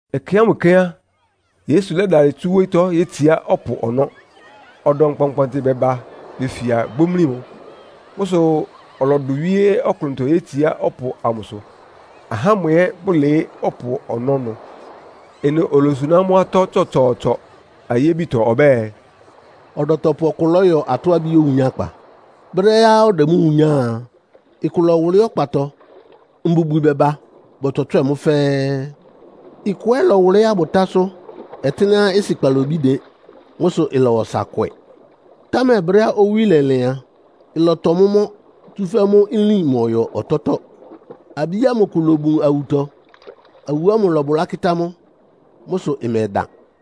Ɛkɛ ámʋ kɛ́n á, Yesu lɛ́dalɩ tsu wóyítɔ́ yétsiá ɔpʋ ɔnɔ́. Ɔdɔm kpɔnkpɔɔnkpɔntɩ bɛba befia bomlí mʋ. Mʋ́ sʋ ɔlɔdʋ wíé ɔklʋntɔ, yétsiá ɔpʋ amʋsʋ, ahá ámʋ ɛ́ bʋlɩɩ́ ɔpʋ ɔnɔ́ ɩnʋ. Ɩnʋ olosuná amʋ́ atɔ́ tsɔtsɔɔtsɔ ayébitɔ ɔbɛ́ɛ, “Ɔdɔtɔpʋ ɔkʋ lɔ́yɔ atɔ́-abí owunyákpa. Brɛ́á ɔdɛ mʋ́ wunyáa a, ɩkʋ lɔ́wʋlɩ́ ɔkpatɔ, mbubwi bɛba bɔtswɛtswɛ́ɛ mʋ́ fɛ́ɛ́. Ɩkʋ ɛ́ lɔwʋlɩ́ abʋtásʋ́, ɔtɩ́nɛ́á ɩsɩ kpalobí dɩn. Mʋ́ sʋ ɩlɔwa ɔsa kwɛ, támɛ brɛ́á owí lɛlɩn a, ɩlɔtɔ mʋ́ mɔ́, tsúfɛ́ mʋ́ nlín mɔyɔ ɔtɔ́tɔ́. Abí ámʋ kʋ lobun awutɔ, awu ámʋ lɔbʋlá kɩ́tá mʋ́. Mʋ́ sʋ ɩmɛdan.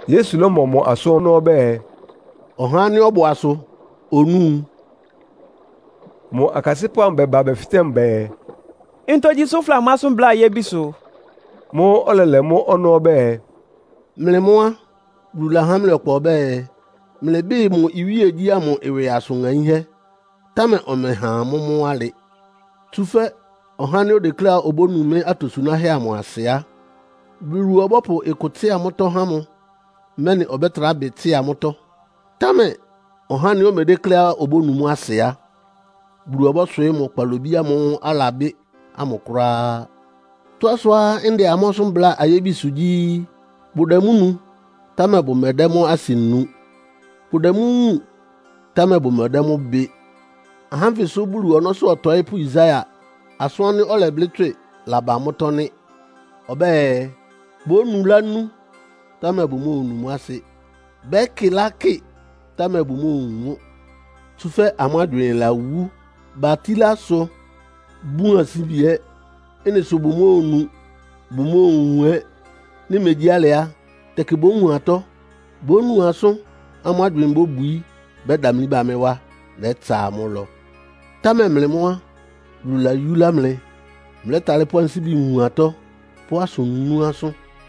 Yesu lɔ́mɔ mʋ asʋ́n ɔnɔ́ ɔbɛ́ɛ, “Ɔha ánɩ́ ɔbʋ asʋ onúu!” Mʋ akasɩ́pʋ́ amʋ bɛba bɛfɩtɛ́ mʋ bɛɛ, “Ntogyi sʋ́ fʋdɛ amʋ́ asʋ́n bláa ayébisʋ?” Mʋ́ʋ́ ɔlɛlɛ mʋ́ ɔnɔ́ ɔbɛ́ɛ, “Mlɩ mʋ́ á, Bulu lahá mlɩ ɔkpa ɔbɛ́ɛ, mlɩbɩ́ɩ mʋ iwíegyí ámʋ ɩwɩ asʋn ŋaínhɛ́, támɛ ɔmɛha amʋ́ mʋ́ alɩ. Tsúfɛ́ ɔhá ánɩ́ odekléá obónu mɩ́ atosunáhɛ́ amʋ asɩ á, Bulu ɔbɔ́pʋ ɩkʋ tsɩ́a mʋ́tɔ́ há mʋ, mɛ́nɩ ɔbɛ́tra bɩ tsɩ́a mʋ́tɔ́. Támɛ ɔhá ánɩ́ omedékléá obónu mʋ́ asɩ á, Bulu ɔbɔ́swɩɩ́ mʋ kpalobí ámʋ́ʋ́ alabɩ́ ámʋ kʋ́ráá. Tɔ́á sʋá ndɛ amʋ́ asʋ́n bláa ayébisʋ gyí, bʋdɛ mʋ́ nu, támɛ bʋmɛdɛ́ mʋ́ asɩ nu. Bʋdɛ mʋ́ wúun, támɛ bʋmɛdɛ́ mʋ́ bɩ. Ahá ánfɩ sʋ́ Bulu ɔnɔ́sʋ́ ɔtɔɩ́pʋ́ Yesaia asʋ́n ánɩ́ ɔlɛblɩ́ tswɩ́ɩ laba mʋ́tɔ́ nɩ́. Ɔbɛ́ɛ, ‘Bónu lánú, támɛ bʋmóonu mʋ́ asɩ. Bɛ́kɩ lákɩ, támɛ bʋmóowun mʋ́. Tsúfɛ́ amʋ́ agywɩɩn lawú. Batílá asʋ, bun ansíbi ɛ́. Ɩ́nɩ sʋ bʋmóonu, bʋmóowun ɛ́. Nɩ́ megyí alɩ á, tɛkɩ bówun atɔ́, bónu asʋ́n, amʋ́ agywɩɩn bóbwií, bɛ́damlí ba mɩ́ wá, nɛ́tsa amʋ́ ɩlɔ.’ “Támɛ mlɩ mʋ́ á, Bulu layúlá mlɩ. Mlɛ́talɩ́ pʋ́ ansíbi wun atɔ́, pʋ́ asʋ nú asʋ́n.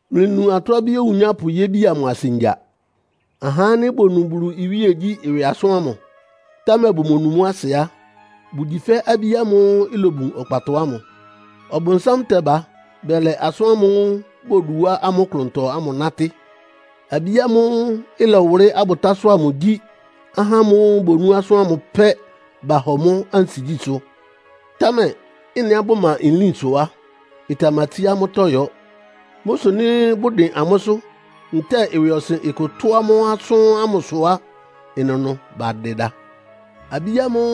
“Mlɩnu atɔ́-abí owunyápʋ yébi amʋ asɩ ngya. Ahá ánɩ́ bonú Bulu iwíegyí ɩwɩ asʋ́n ámʋ, támɛ bʋmonu mʋ́ asɩ á, bʋgyi fɛ́ abí ámʋ́ʋ́ ilobun ɔkpatɔ ámʋ. Ɔbʋnsám tɛba bɛlɛ asʋ́n ámʋ́ʋ́ bodu wá amʋ́ klʋntɔ ámʋ nátɩ́. Abí ámʋ́ʋ́ ɩlɔwʋlɩ́ abʋtásʋ́ amʋ gyí ahá ámʋ́ʋ́ bonú asʋ́n ámʋ pɛ́, bahɔ mʋ́ ansigyísʋ́, támɛ ɩ́nɩá bʋma nlín sʋ á, ɩtamatsíá amʋ́tɔ́ yɔ́. Mʋ́ sʋ nɩ́ bʋdɩn amʋ́sʋ́ ntɛ́ɛ ɩwɩɔsɩn kʋ ɩtʋ́ amʋ́ asʋ́n ámʋ sʋ á, ɩnʋnʋ bʋtɛdɩda. Abí ámʋ́ʋ́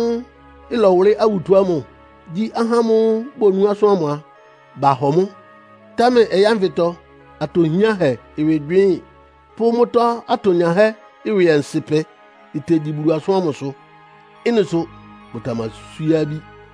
ɩlɔwʋlɩ́ awutɔ ámʋ gyí ahá ámʋ́ʋ́ bonú asʋ́n ámʋ a, bahɔ mʋ́, támɛ ɔyɩ́ ánfɩtɔ atɔ hiánhɛ ɩwɩ gywɩɩ́n pʋ́ mʋ́tɔ́ atonyahɛ́ ɩwɩ ɔnsɩ́pɛ tegyi Bulu asʋ́n ámʋsʋ. Ɩ́nɩ sʋ bʋtamaswíé abí.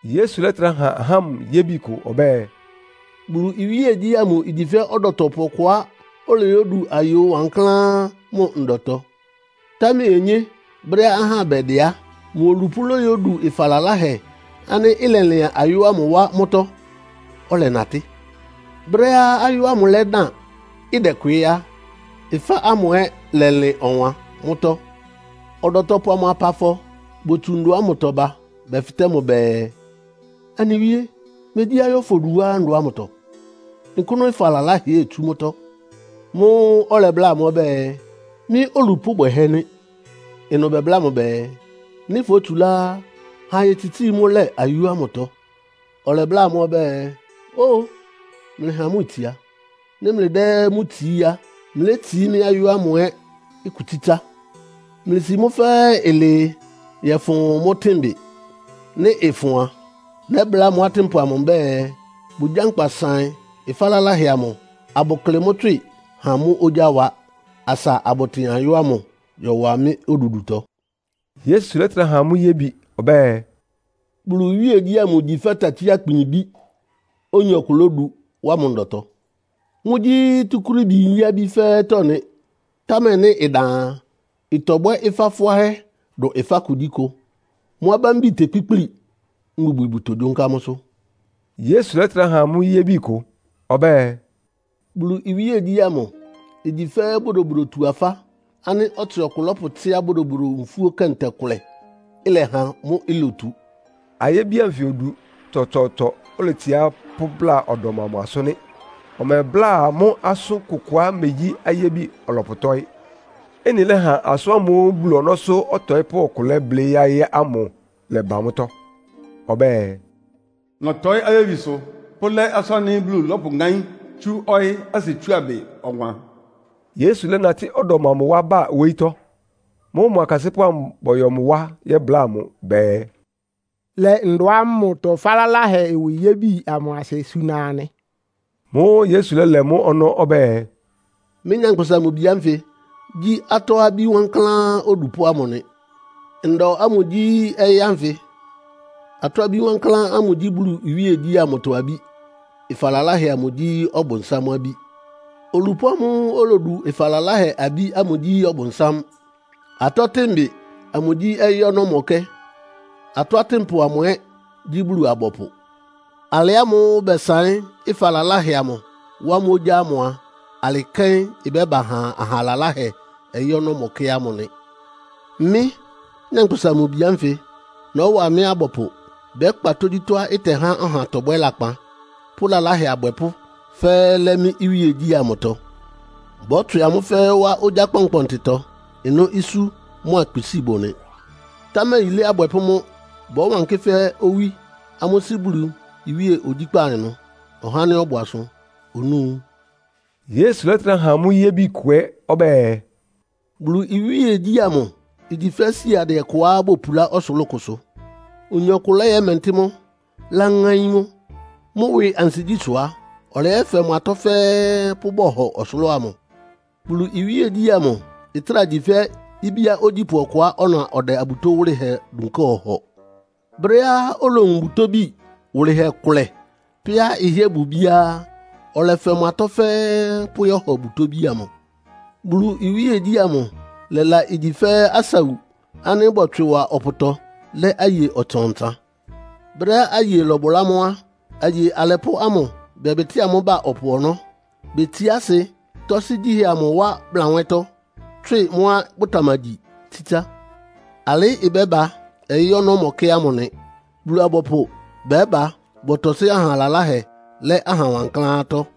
Yesu lɛ́trá ha ahá ámʋ yébi kʋ ɔbɛ́ɛ, “Bulu iwíegyí ámʋ igyi fɛ́ ɔdɔtɔpʋ ɔkʋá oloyódu ayó wankláán mʋ ndɔtɔ. Támɛ onyé, brɛ́á ahá bɛdɩ á, mʋ olupʋ́ lóyódu ɩfa laláhɛ ánɩ́ ɩlɛlɩan ayó ámʋ wá mʋ́tɔ́, ɔlɛnatɩ́. Brɛ́á ayó ámʋ lɛ́dan, ɩdɛkwɩɩ́ á, ɩfá ámʋ ɛ́ lɛlɩn ɔwan mʋ́tɔ́. Ɔdɔtɔpʋ amʋ apafɔ botsu ndɔ ámʋtɔ ba bɛfɩtɛ́ mʋ bɛɛ, ‘Anɩ wíé, megyí ayó fodu wá fʋ́ ndɔ ámʋtɔ? Nkʋ́nʋ́ ɩfa laláhɛ ɛ́ itsú mʋ́tɔ́?’ Mʋ́ʋ́ ɔlɛbláa amʋ́ ɔbɛ́ɛ, ‘Mɩ́ olupʋ́ bwɛhɛ́ nɩ́.’ Ɩnʋ bɛbláa mʋ bɛɛ, ‘Nɩ́ fótsulá á, ha ayetsitsíi mʋ́ lɛ ayó ámʋtɔ.’ Ɔlɛbláa amʋ́ ɔbɛ́ɛ, ‘Ó-o! Mlɩha mʋ́ itsia. Nɩ́ mlɩdɛ́ mʋ́ tsií á, mlétsií mɩ́ ayó ámʋ ɛ́ kʋ tsítsá. Mlɩsi mʋ́ fɛ́ɛ́ ɩlɩɩ yɔ́fʋn mʋ́ tɩ́nbɩ. Nɩ́ ɩfʋn a, nɛ́bláa mʋ́ atɩ́npʋ mbɛ́ɛ, bʋgyánkpa saɩn ɩfa laláhɛ amʋ, abʋklɩ mʋ́ tswɩ ha mʋ́ ogyá wa, asa abʋtɩn ayó ámʋ yɔwa mɩ́ odudutɔ.’” Yesu lɛ́trá ha amʋ́ yébi ɔbɛ́ɛ, “Bulu iwíegyí ámʋ igyi fɛ́ takyí-akpin ibí, oyin ɔkʋ lódu wá mʋ ndɔtɔ. Mʋ́gyí túkúrííbi nyí-abí fɛ́ɛ́tɔ́ nɩ, támɛ nɩ́ ɩdan a, ɩtɔbwɛ́ ɩfá fʋ́áhɛ́ dʋn ɩfá kugyíkʋ. Mʋ́ abámbi tekpíkpli, mbubwi bʋtogyónká mʋ́sʋ́.” Yesu lɛ́trá ha amʋ́ yébi kʋ ɔbɛ́ɛ, “Bulu iwíegyí ámʋ igyi fɛ́ bodobodotu-afá ánɩ́ ɔtsɩ ɔkʋ lɔ́pʋtsɩ́á bodobodo nfúó kɛntɛ kʋlɛ, ɩlɛha mʋ́ lotu.” Ayébi anfɩ odu tsɔtsɔɔtsɔ oletsiá pʋ́bláa ɔdɔm amʋ asʋ́n nɩ́. Ɔmɛbláa amʋ́ asʋ́n kʋkʋá imegyí ayébi ɔlɔpʋtɔ́ɩ́. Ɩ́nɩ lɛ́ha asʋ́n ámʋ́ʋ́ Bulu ɔnɔ́sʋ́ ɔtɔɩ́pʋ́ ɔkʋ lɛ́blɩ́ yáɩ́ ámʋ lɛ́ba mʋ́tɔ́. Ɔbɛ́ɛ, “Nɔ́tɔɩ́ ayébisʋ pʋ́lɛ́ asʋ́n ánɩ́ Bulu lɔ́pʋŋáín tsú ɔyɩ́ asɩtsuábɩ ɔwan.” Yesu lɛ́natɩ́ ɔdɔm amʋ wá ba wóyítɔ́. Mʋ́ʋ́ mʋ akasɩ́pʋ́ amʋ bɔyɔ mʋ wá yɛ́bláa mʋ bɛɛ, “Lɛ ndɔ ámʋtɔ ɩfa laláhɛ ɩwɩ yébi amʋ asɩ suna anɩ.” Mʋ́ʋ́ Yesu lɛ́lɛ mʋ́ ɔnɔ́ ɔbɛ́ɛ, “Mɩ́, Nyankpʋsa-Mʋ-Bi ánfɩ gyí atɔ́-abí wankláán odupʋ́ ámʋ nɩ. Ndɔ ámʋ gyí ɔyɩ́ ánfɩ. Atɔ́-abí wankláán ámʋ gyí Bulu iwíegyí ámʋtɔ abí. Ɩfa laláhɛ amʋ gyí Ɔbʋnsám abí. Olupʋ́ ámʋ́ʋ́ olodu ɩfa laláhɛ abí ámʋ gyí Ɔbʋnsám. Atɔ́tɩnbɩ amʋ gyí ɔyɩ́ ɔnɔ́mɔkɛ́. Atɔ́ atɩ́npʋ amʋ ɛ́ gyí Bulu-abɔpʋ. “Alɩ ámʋ́ʋ́ bɛsaɩ́n ɩfa laláhɛ amʋ, wá mʋ́ ogyá ámʋ a, alɩ́ kɛ́n ɩbɛ́ba ha aha laláhɛ ɔyɩ́ ɔnɔ́mɔkɛ́ ámʋ nɩ. Mɩ́, Nyankpʋsa-Mʋ-Bi ánfɩ nɔ́wa mɩ́ abɔpʋ bɛ́kpa tógyítɔ́á ɩtɛhá ɔha tɔbwɛ́ lakpan pʋ́ lalahɛ abwɛpʋ́ fɛ́ɛ́ lɛ́ mɩ́ iwíegyí amʋtɔ. Bɔ́tswɩ amʋ́ fɛ́ɛ́ wá ogyá kpɔnkpɔntɩtɔ. Ɩnʋ́ isú mʋ́a kpisíi bʋ nɩ. Támɛ yilé abwɛpʋ́ mʋ́ bɔ́wankɩ́ fɛ́ owí amʋ́ Sɩ́ Bulu iwíe ogyíkpá ɩnʋ. Ɔhá ánɩ́ ɔbʋ asʋ onúu.” Yesu lɛ́trá ha amʋ́ yébi kʋ ɛ́ ɔbɛ́ɛ, “Bulu iwíegyí ámʋ igyi fɛ́ siadɩɛ kʋá bopulá ɔsʋlʋ́ʋ kʋsʋ. Oyin ɔkʋ lɛ́yɛ́mɛntɩ́ mʋ́, láŋáín mʋ́. Mʋ́ ɩwɩ ansigyí sʋ á, ɔlɛyɛ́fɛ mʋ atɔ́ fɛ́ɛ́ pʋ́bɔhɔ ɔsʋlʋ́ʋ amʋ.” Bulu iwíegyí ámʋ ɩtráa gyi fɛ́ ibíá ogyípʋ́ ɔkʋá ɔna ɔdɛ abutó wʋ́lɩhɛ dunká ɔhɔ. Brɛ́á olowun butóbi wʋlɩhɛ kʋlɛ pɛ́á ɩhɩ́ɛ́ bʋ ibíá á, ɔlɛfɛ mʋ atɔ́ fɛ́ɛ́ pʋ́yɔ́hɔ butóbi amʋ. Bulu iwíegyí ámʋ lɛ́la igyi fɛ́ asawu ánɩ́ bɔtswɩ wa ɔpʋtɔ lɛ́ aye ɔtsan-ɔtsan. Brɛ́á aye lɔbʋlá mʋ́ á, aye alɛpʋ́ ámʋ bɛbɩtɩ́a mʋ́ ba ɔpʋ ɔnɔ́. Betsiá asɩ, tɔ́sɩ́ gyíhɛ amʋ wá blanwɛ́tɔ́, tswɩ mʋ́á bʋtamagyi tsítsá. Alɩ́ ɩbɛ́ba ɔyɩ́ ɔnɔ́mɔkɛ́ ámʋ nɩ. Bulu-abɔpʋ bɛ́ba bɔtɔsɩ́ aha laláhɛ lɛ́ aha wankláántɔ́.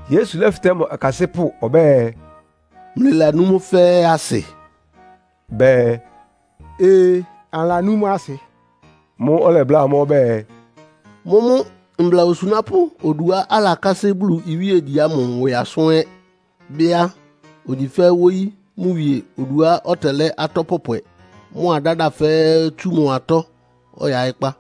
Yesu lɛ́fɩtɛ́ mʋ akasɩ́pʋ́ ɔbɛ́ɛ, “Mlɩlanú mʋ́ fɛ́ɛ́ asɩ?” Bɛɛ, “Ee, anɩlanú mʋ́ asɩ.” Mʋ́ʋ́ ɔlɛbláa amʋ́ ɔbɛ́ɛ, “Mʋ́mʋ́ mbla osunápʋ́ oduá alakásɩ́ Bulu iwíegyí ámʋ ɩwɩ asʋ́n ɛ́ bɩ́ á, ogyi fɛ́ wóyí mʋ wie oduá ɔtɛlɛ́ atɔ pɔpwɛ mʋ́a dáda fɛ́ɛ́ tsú mʋ atɔ́ ɔyaɩ́kpá.”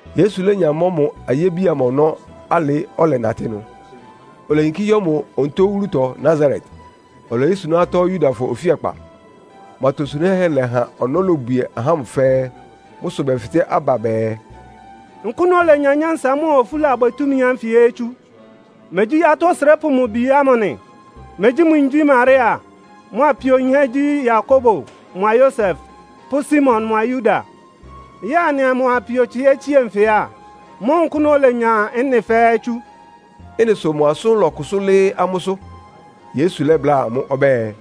Yesu lénya mɔ́ mʋ ayébi amʋ ɔnɔ́ alɩ, ɔlɛnatɩ́ ɩnʋ. Oleyinkí yɔ́ mʋ onutó wúlutɔ Nasaret, oloyósuná atɔ́ Yudafɔ ofíakpa. Mʋ atosunáhɛ́ lɛha ɔnɔ́ lobwie ahá ámʋ fɛ́ɛ́. Mʋ́ sʋ bɛfɩtɛ́ aba bɛɛ, “Nkʋ́nʋ́ olenya nyánsa mʋ́a ofúlabwɛ túmi ánfɩ ɛ́ tsú? Megyí atɔ́ osrépʋ́ mʋ bi ámʋ nɩ? Megyí mʋ yin gyí Maria, mʋ apio yinhɛ́ gyí Yakobo mʋa Yosef pʋ́ Simon mʋa Yuda? Yɛ́ɛ anɩa mʋ apio tsɩhɛ́ tsie nfɩ á? Mʋ́ʋ́ nkʋ́nʋ olenya ɩ́nɩ fɛ́ɛ́ tsú?” Ɩ́nɩ sʋ mʋ asʋ́n lɔ́kʋsʋ́ lɩ́ɩ́ amʋ́sʋ́. Yesu lɛ́bláa amʋ́ ɔbɛ́ɛ,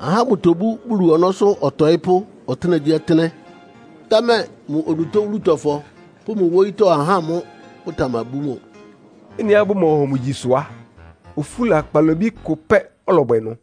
“Ahá bʋtobú Bulu ɔnɔ́sʋ́ ɔtɔɩ́pʋ́ ɔtɩ́nɛgyíɔtɩ́nɛ́, támɛ mʋ onutó wúlutɔfɔ pʋ́ mʋ wóyítɔ́ ahá mʋ́ bʋtamabú mʋ.” Ɩ́nɩá bʋmɔhɔ mʋ gyi sʋ á, ofúla kpalobí kʋ pɛ́ ɔlɔbwɛ ɩnʋ.